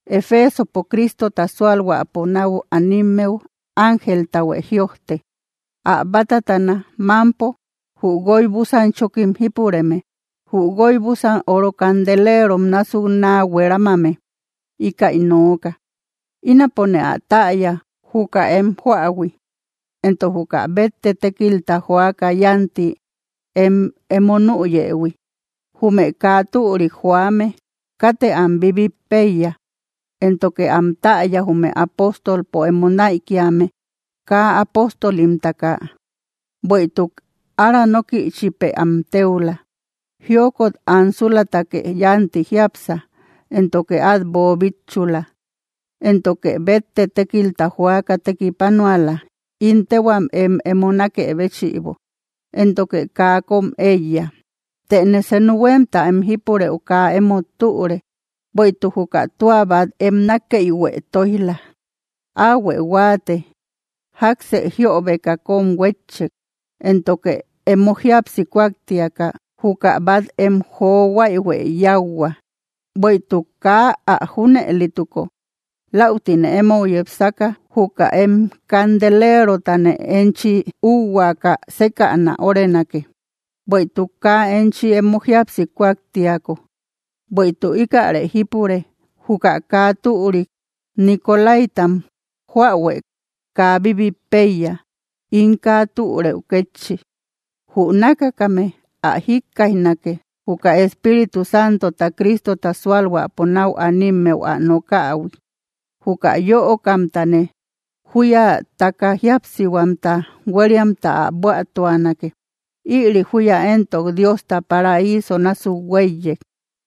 ’Efeesopo Cristota sualhuäpo nau animmeu ángeltahuë jïojte: “Ä bátatana mámpo jü guoy búsan chókim jípureme, jü guoy búsan oro candelerom násuk naa hueramame, íkäi nooka: Ínapone ä täya, juka em juähui, entok juka bétte tékilta joaka yánti em emo nüyëhui. Jume kaa türik joame katë am bibit péiya. Éntoke am täya, jume apóstolpo emo naïkiame kaa apóstolimtaka, bueïtuk ára nókïchipë ä téula. Jiokot ansulatake yánti jiápsa, éntoke át boobitchula, éntoke bétte tékilta joaka tekipanuala, ín téhuam em emo nákë béchïbo, éntoke kaa kóm éiya. Tëne senu huémta em jípurëu kaa emót türe, bueïtuk juka tua bat em nákeïhuë tóij‑la. Áhuë huáate, jáksë jiöbeka kón huétchek. Éntoke emo jíapsi kuaktiaka, juka bat em jojuaïhuë yáuhua. Bueïtuk kaa ä junëlituko, läutine emou yepsaka juka em candelerotane enchi ühuaka sékäna órenake, bueïtuk kaa enchi emo jíapsi kuaktiako. Bueïtuk íkäre jípure: juka kaa türik nicolaítam joähuë kaa bibit péiya, ín kaa türëu kétchi. Jü nákakame ä jikkaijnake, juka Espíritu santota Cristota sualhuäpo nau animmeu ä nokähui. Juka yöokamtane, júya taka jíapsihuamta hueriamta ä buätuanake. Ïri júya éntok Diosta paraíso násuk huéiyek.”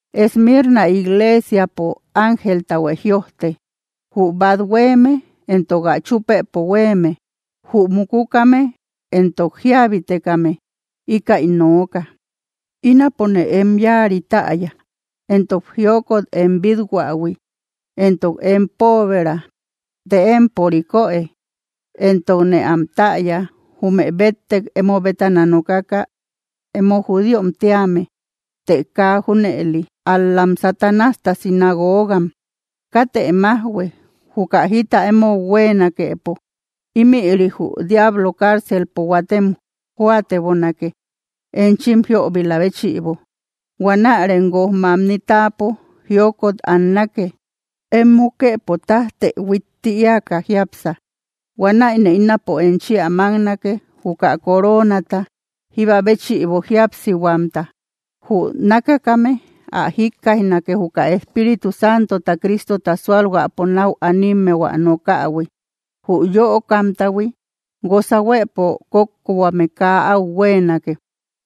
’Esmirna iglesiapo ángeltahuë jïojte: “Jü bát huéeme éntok ä chúpëpo huéeme, jü mukukame entok jíabeitekame, íkäi nooka: Ínapone em yáari täya, entok jiokot em bíthuähui, entok em poobëra. Të empo rikoë. Entokne am täya, jume bettek emo bétana nokaka emo judíom tíame. Të kaa junëli, ál‑lam Satanásta sinagoogam. Katë májhue, juka jita emou huéenakepo. Ímïri jü diablo cárcelpo huatem jóatebonake, enchim jiöbila béchïbo. Huanärem guoj mamni táapo jiokot annake. Em mukëpo tájtë huitti éaka jiápsa. Huanäine ínapo enchi ä máknake, juka coronata jíba béchïbo jíapsihuamta. Jü nákakame ä jikkaijnake, juka Espíritu Santota Cristota sualhuäpo nau animmeu ä nokähui. Jü yöokamtahui, guosa huëpo kókkohuame kaa áu huéenake.”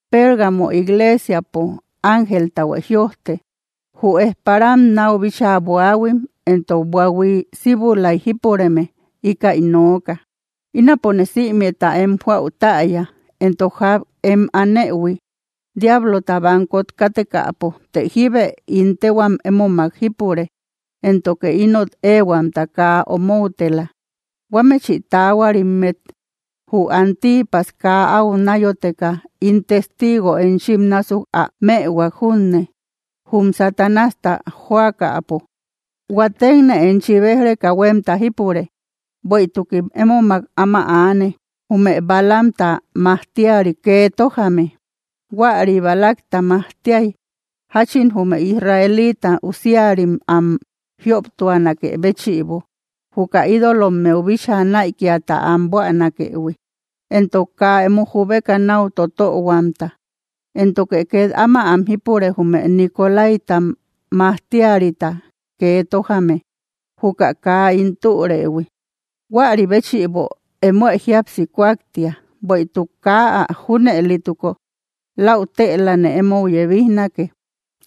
’Pérgamo iglesiapo ángeltahuë jïojte: “Jü ejparam náu bíchaa buahuim entok buahui síbulay jípureme, íkäi nooka: Ínapone sïmeta em joäu täya, entok ják em anëhui diablota bankot kátekäpo, të jíbe ín téhuam émomak jípure. Éntoke inot éehuamta kaa omoutela, huámëchi taahuarimmet jü Antipas kaa au náyoteka ín testigo enchim násuk ä mëhuak junne, jum Satanásta jóakäpo. Huatekne enchi béj‑reka huémta jípure: bueïtukim émomak áma aane, jume Balaamta majtiari kee tójame. Huäri Balacta majtiay, jáchin jume israelita usiarim am jioptuanakë béchïbo, juka ídolommeu bíchaa näikiata am buänakëhui, entok kaa emo jubeka náu totöhuamta. Éntoke két áma am jípure, jume nicolaítam majtiarita kee tójame, juka kaa ín türëhui. Huäri béchïbo, emoë jíapsi kuaktia; bueïtuk kaa ä junëlituko, läutëlane emou yebijnake.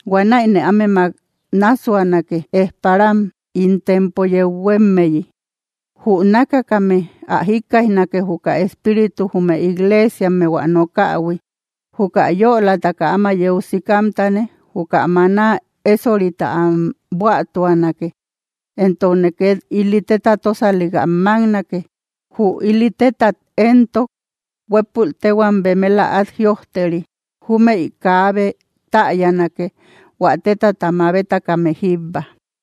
Huanäine ámemak náassuanake, ejparam ín tempo yeu huémmeyi. Jü nákakame ä jikkaijnake, juka Espírituta jume igleesiammeu ä nokähui. Juka yölataka áma yeu sikamtane, juka maná ésorita am buätuanake, éntokne ket ili téta tósalik ä máknake. Jü ili tétat éntok, huépul téhuam bemela át jïojteri; júmëi kaabe täyanake, hua tétata mabetakame jíbba.”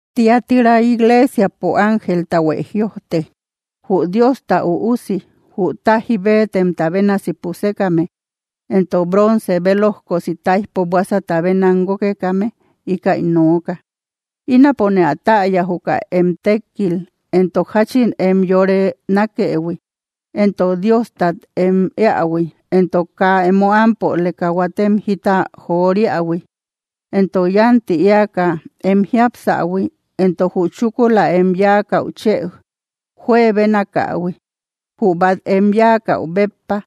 ’Tiatira iglesiapo ángeltahuë jïojte: “Jü Diosta Üusi, jü táji béetemta bénasi pusekame, éntok bronce bélojkosi táijpo buásata bénam guókekame, íkäi nooka: Ínapone ä täya, juka em tékkil, entok jáchin em yore nákëhui, entok Diostat em éähui, entok kaa emo ámpoleka huatem jita joriähui, entok yánti éaka em jiápsahui, entok jü chúkula em yáakäu chë juebenakähui jü bat em yáakäu béppa.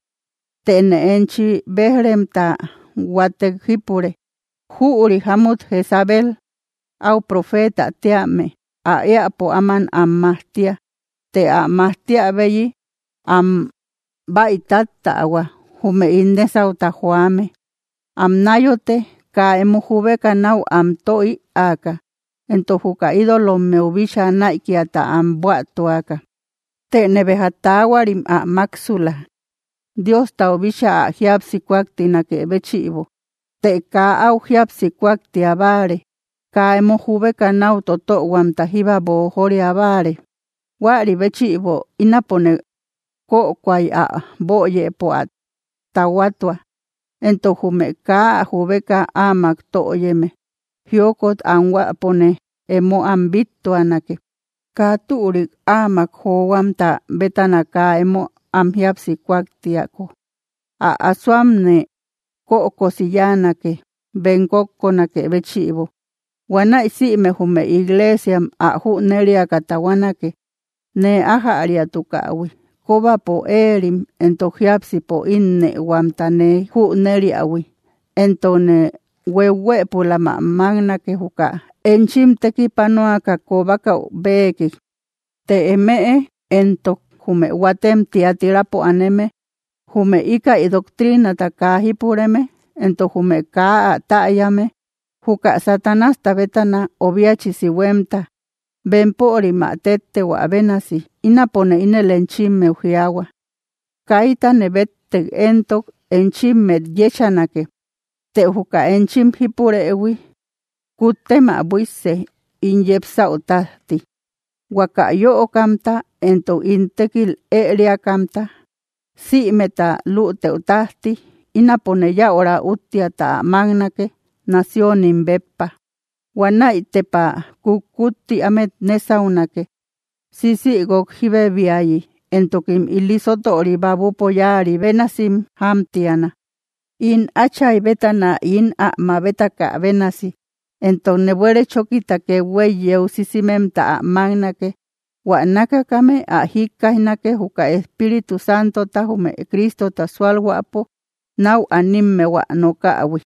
Tëne enchi béj‑remta huatek jípure: Jüri jámut Jezabel aú profetä tíame ä éäpo áman am majtia, të ä majtiabeyi am bäi táttähua, jume ín nésauta joame, am náyote kaa emo jubeka nau am tö ïaaka, entok juka ídolommeu bíchaa näikiata am buätuaka. Tëne béja taahuarim ä máksula, Diostau bíchaa ä jíapsi kuaktianakë béchïbo. Të kaa áu jíapsi kuaktia báare; kaa emo jubeka náu totöhuamta jíba boojoria báare. Huäri béchïbo ínapone kökoay ä böyëpo ä tahuatua, entok jume kaa ä jubeka áamak töyeme. Jiokot anhuäpone emo am bíttuanake, kaa türik áamak johuamta bétana kaa emo am jíapsi kuaktiako. Ä asoamne kökosi yáanake, bem kókkonakë béchïbo. Huanäi sïme jume igleesiam ä jüneriaka tahuanake, nee ájäriatukähui, kóbapo éerim éntok jiápsipo ínnëhuamta nee jüneriähui. Éntokne huéu‑huëpulam ä máknake, juka enchim tekipanuaka kobakäu béekik. Të eme éntok, jume huatem Tiatirapo aneme, jume íkäi doctrinata kaa jípureme, entok jume kaa ä täyame, juka Satanásta bétana obiachisi huémta, bempörim ä téttehuä bénasi, ínapone ínel enchimmeu jiaahua: Kaitane béttek éntok enchimmet yéchanake. Të juka enchim jípurëhui, kuttem ä buísse, ín yepsäu tájti. Huaka yöokamta éntok ín tékil ériakamta sïmeta lüteu tájti, ínapone yäura úttiata ä máknake, naciónim, béppa. Huanäi tepa kutkutti ámet nésaunake, sisïguok jíbebiayi, éntokim ili sótöri babupo yáari bénasim jámtiana, ín Áchay bétana ín ä mabetakä bénasi. Éntokne buere chókita kethuey yeu sisimemta ä máknake. Huä nákakame ä jikkaijnake, juka Espíritu Santota jume Cristota sualhuäpo nau animmeu ä nokähui.”